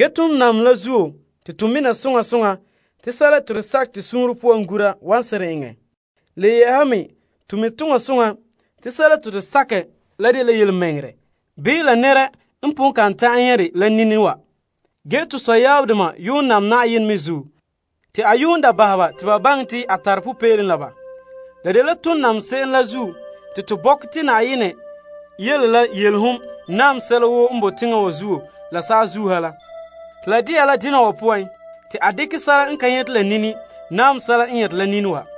Ton nam Yenɛ la zuo te to mina soŋa soŋa te sɛla te to sakɛ to suunre poan gura wan seren eŋɛ. To mi' la dela yelemɛŋɛrɛ bii to pon kan ta'an nyɛ' dɛ la to nini wa. To sɔyaabdoma n yuun nam Yenɛ me zuo te a bahɛ ba te ba baŋɛ te a tare popeelom la ba. Ton nam se'em la zuo te to bɔkɛ te Yenɛ yele la yelehom naam sɛla woo n boe teŋa wa zuo la saazuo ha la te a dekɛ sɛla n ka nyɛte la nini naam sɛla n nyɛte la nini wa.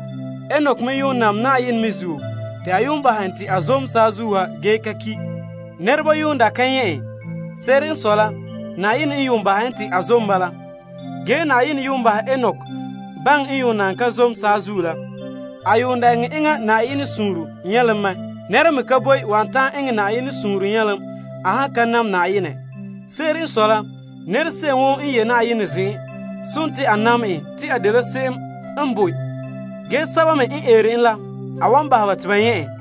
Enok me yuun nam Yenɛ me zuo, a bahɛ en te a zom saazuo ha ge ka ki'. Nɛreba yuun da ka nyɛ' en, Yenɛ n yuun da bahɛ en te a zom la zuo. En ka zom saazuo la, Yenɛ bahɛ en ta mi te en eŋɛ Yenɛ suunre nyɛlom mɛ. Nɛra me ka boe wan ta'an eŋɛ Yenɛ suunre nyɛlom a han ka nam Yenɛ. Se'ere n sɔe la, nɛra se'em woo n ye' Yenɛ zen'en, sontii a nam en te a dela se'em n boe ge sɛba me n eere en la, a wan bahɛ ba te ba nyɛ' en.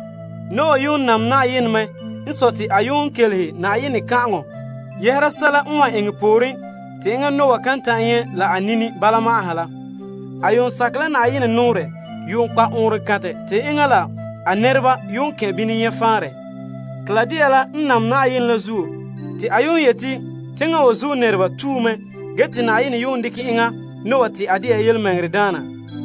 Noah me yuun nam Yenɛ, Yenɛ n kan'aŋɔ yɛhera sɛla n wan eŋɛ pooren te enŋa kan ta'an nyɛ' la a nini bala ma'an ha la. A sakɛ la Yenɛ nɔɔrɛ kpa' ɔɔnrɔŋkantɛ te enŋa la a nɛreba yuun kɛn' bini nyɛ' faanrɛ. A nam Yenɛ la zuo te a yeti teŋa wa zuo nɛreba tue mɛ ge a nam la zuo Yenɛ dekɛ enŋa Noah te a dela tontɔɔdaana.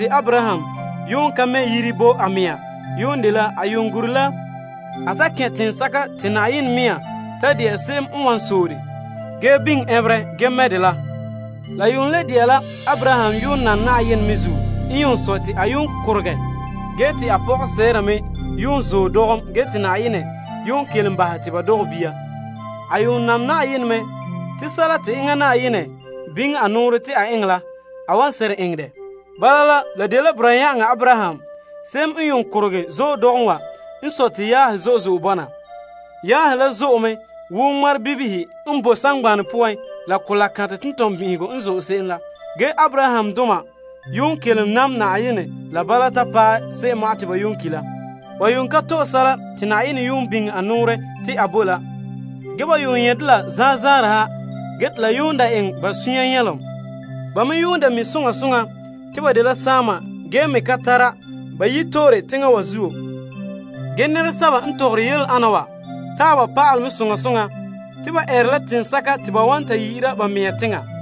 Abraham ka mɛ' yire bo a mɛŋa. Se'ere n sɔe a gura la a ta kɛn' teŋsɛka te Yenɛ mɛŋa sɔɔn dɛ ge biŋe ɛnberɛ ge mɛ' dɛ la. Abraham n yuun nam Yenɛ me zuo n sɔe te a korogɛ paɛ paɛ ge te a pɔga Sarah me gaŋɛ dɔgom ge te Yenɛ kelom bahɛ te a dɔgɛ bia. A nam Yenɛ te sɛla te enŋa Yenɛ biŋe a nɔɔrɛ te a eŋɛ la, a wan seren eŋɛ dɛ. Bala, la dela boraa yan'aŋa n yuun korogɛ gaŋɛ dɔgom wa n sɔe te yaahe zo'e zo'e bɔna. A yaahe la zo'e me wo ŋmarebibihe n boe saŋgbana poan la kolaa kantɛ tentɔnbin'ihegɔ n zone se'em la. Nɛrebana wa zan'an yuun kelom nam Yenɛ la bala ta paɛ se'em ma'an te ba ki' la. Ba ka to'e sɛla te Yenɛ biŋe a nɔɔrɛ te a bo la. Ge, ba nyɛ' dɛ la zanzaarɛ ha ge te la daa eŋɛ ba sunya nyɛlom. Ba me daa mi' te ba dela saama ge me ka tara ba yito'ore teŋa wa zuo. Nɛresɛba n tɔgɔre yele ana taaba pa'alɛ mɛ soŋa soŋa te ba eere la teŋsɛka te ba wan ta yi'ira ba mɛŋa teŋa.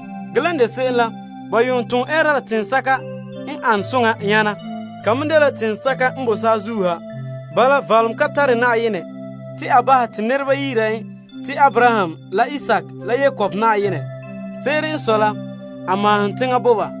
Ge lan de se'em la, ba yuun da ton ɛɛra la teŋsɛka n ane soŋa nyana. Ka me dela teŋsɛka n boe saazuo ha. Bala, valom ka tare Yenɛ te a bahɛ te ba yi'ira en ba Yenɛ. Se'ere n sɔe la, a maahom teŋa bo ba.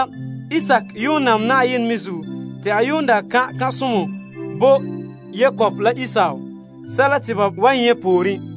Isaak yuun nam Yenɛ me zuo te a daa kan' kan'somɔ bo Yakob la Esau sɛla te ba wan nyɛ' pooren.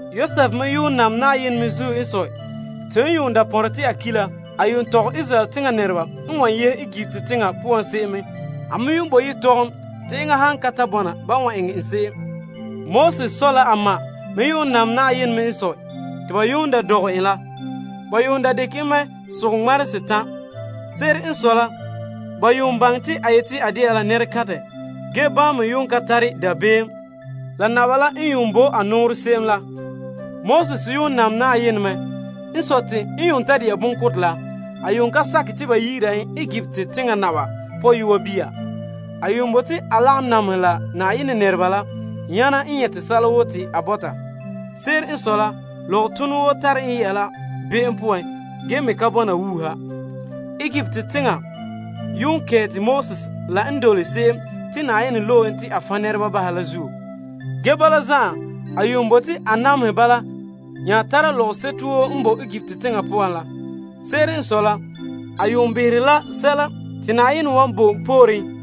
Yosef me yuun nam Yenɛ me zuo n sɔe, te n daa pɔnre te a ki' la, a tɔgɛ Israel teŋa nɛreba n wan yehe Egipt teŋa poan se'em mɛ, bo ba yetɔgom te enŋa han ka ta bɔna ba eŋɛ en se'em. Moses dɔgɔreba yuun nam Yenɛ me n sɔe, te ban daa dɔgɛ en la, ba dekɛ en mɛ sogɛ ŋmarehe setan'. Se'ere n sɔe la, ba behɛ te a som mɛ ge bama me ka tare dabeem la naba la n bo a nɔɔrɛ la se'em la. Moses yuun me nam Yenɛ mɛ n sɔe te ta de'a bonkotɛ la, a ka sakɛ te nɛreba yi'ira en Faro pɔyɔa bia, en bote la a lagom nameha la Yenɛ nɛreba nyana a nyɛta lɔgɔtonɔ woo n tara be'em poan ge me ka bɔna wuuha. Egipt teŋa yuun kɛɛta Moses la n dole Krista la zuo. Ge bala zan'an, a bote a namehɛ bala nyana a tara lɔgɔseto woo n boe Egipt teŋa poan la. Se'ere n sɔe la, a behera la sɛla te Na'ayenɛ wan bo pooren.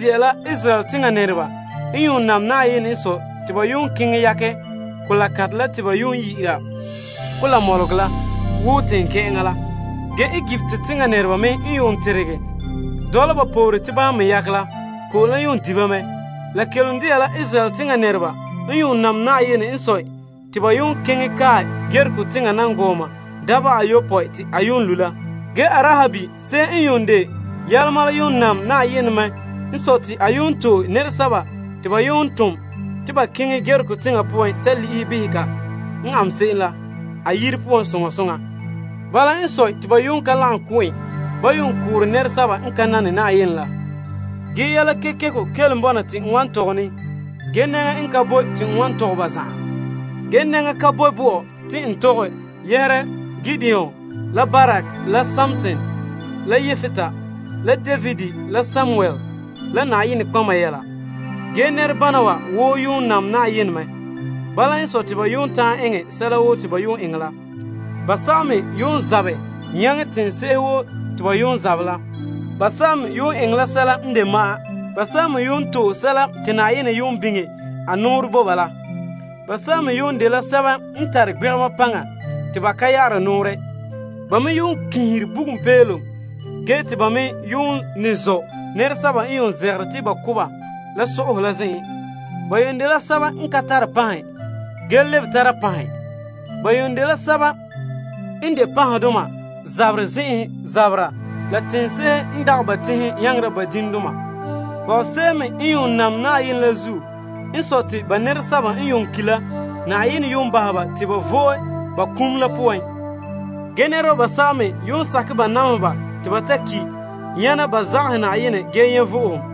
Israel nɛreba n yuun nam Yenɛ n sɔe te ba keŋɛ yakɛ Mɔgɔ Mɔlega la wo teŋkɛ'ɛŋa la. Ge Egipt teŋa nɛreba me n teregɛ dɔla ba poore te bama me yakɛ la, ko'om la di ba mɛ. La kelom dela Israel teŋa nɛreba n yuun nam Yenɛ n sɔe te ba keŋɛ kae Yeriko teŋa dangɔɔma dabeha ayopɔe te a lo' la. Ge Arahab se'em n de yiyɛa la yuun nam Yenɛ me n sɔe te a to'e nɛresɛba te ba tom te ba keŋɛ Yeriko teŋa poan ta le'ehɛ behɛ ka an se'em la, a yire poan soŋa soŋa. Bala n sɔe, te ba ka lagom ko' en ban da koore nɛresɛba n ka nane Yenɛ la. Te yɛla kekeko kelom bɔna te n wan tɔgɛ ne. Ge nɛŋa ka boe bɔ'ɔ te n tɔgɛ yɛhera Gideon la Barak la Samson la Yepta la David la Samuel la nɔtɔgɔheba yɛla. Bama woo yuun nam Yenɛ mɛ ge ta'an eŋɛ sɛla woo te ba eŋɛ la. Ba basɛba zabɛ nyaŋɛ teŋse'ehe woo te ba zabɛ la, eŋɛ la sɛla n de ma'an, to'e sɛla te Yenɛ biŋe a nɔɔrɛ bo ba la, tare gbegema paŋa te ba ka ya'ara nɔɔrɛ. Ba me yuun kiinhere bugum peelom, zɔ' nɛresɛba n zegere te ba ko' ba la so'ahe zen'en, ka tare panhe ge lebege tara panhe, de panhedoma zaberɛ zen'enhe zabera ge ba nyaŋera teŋse'ehe n dagɛ la ba teŋhe. Pɔgɔse'ehe me to'e ba nɛresɛba n yuun ki' ge Yenɛ bahɛ te ba le vo'e. Ge nɛreba basɛba me yuun sakɛ ba namehe ba te ba ta ki' nyana ba zagahɛ Yenɛ ge nyɛ' vo'ohom.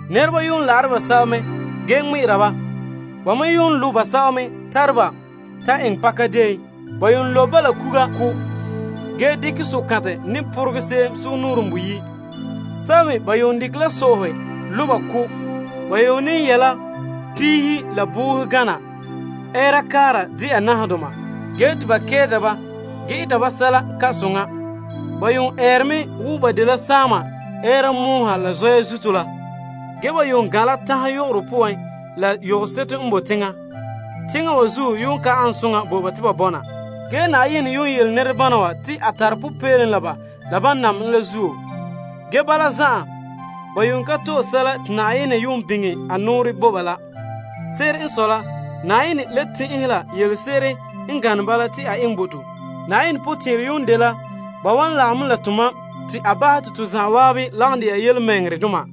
Nɛreba yuun la'are basɛba mɛ ge ŋmɛ'ɛra ba. Ba me lo' basɛba me tare ba ta eŋɛ pakadeen. Ba yuun lobe ba la kuga ko' ge dekɛ sokantɛ ne poregɛ se'em sugumnɔɔren boyi'. Sɛba me ba dekɛ la so'ahe lo' ba ko'. Ba ne yɛ' la piihe la boohe gana ɛɛra kaara dɛna nahadoma, ge te ba nameha ba ge eta ba sɛla n ka soŋa. Ba yuun eere mɛ wo ba dela saama ɛɛra mɔɔ ha la zɔya zuto la. Ba gan' la tanhe yogoro poan la yogoseto n bo teŋa. Teŋa wa zuo ka ane soŋa bo ba te ba bɔna. Yenɛ yuun yele nɛrebana wa te a tare popeelom la ba la ban nam en la zuo. Ge bala zan'an, ba ka to'e sɛla te Yenɛ yuun biŋe a nɔɔrɛ bo ba la. Ge Yenɛ le tɛn'ɛhɛ la yelese'ere n gane bala te a eŋɛ bo to. Yenɛ potɛn'ɛrɛ dela ba wan lagom mɛ la tomam te a bahɛ to zan'an lagom dɛna tontɔɔdoma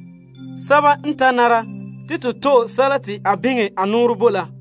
sɛba n ta nare te to to'e sɛla te a biŋe a nɔɔrɛ bo la.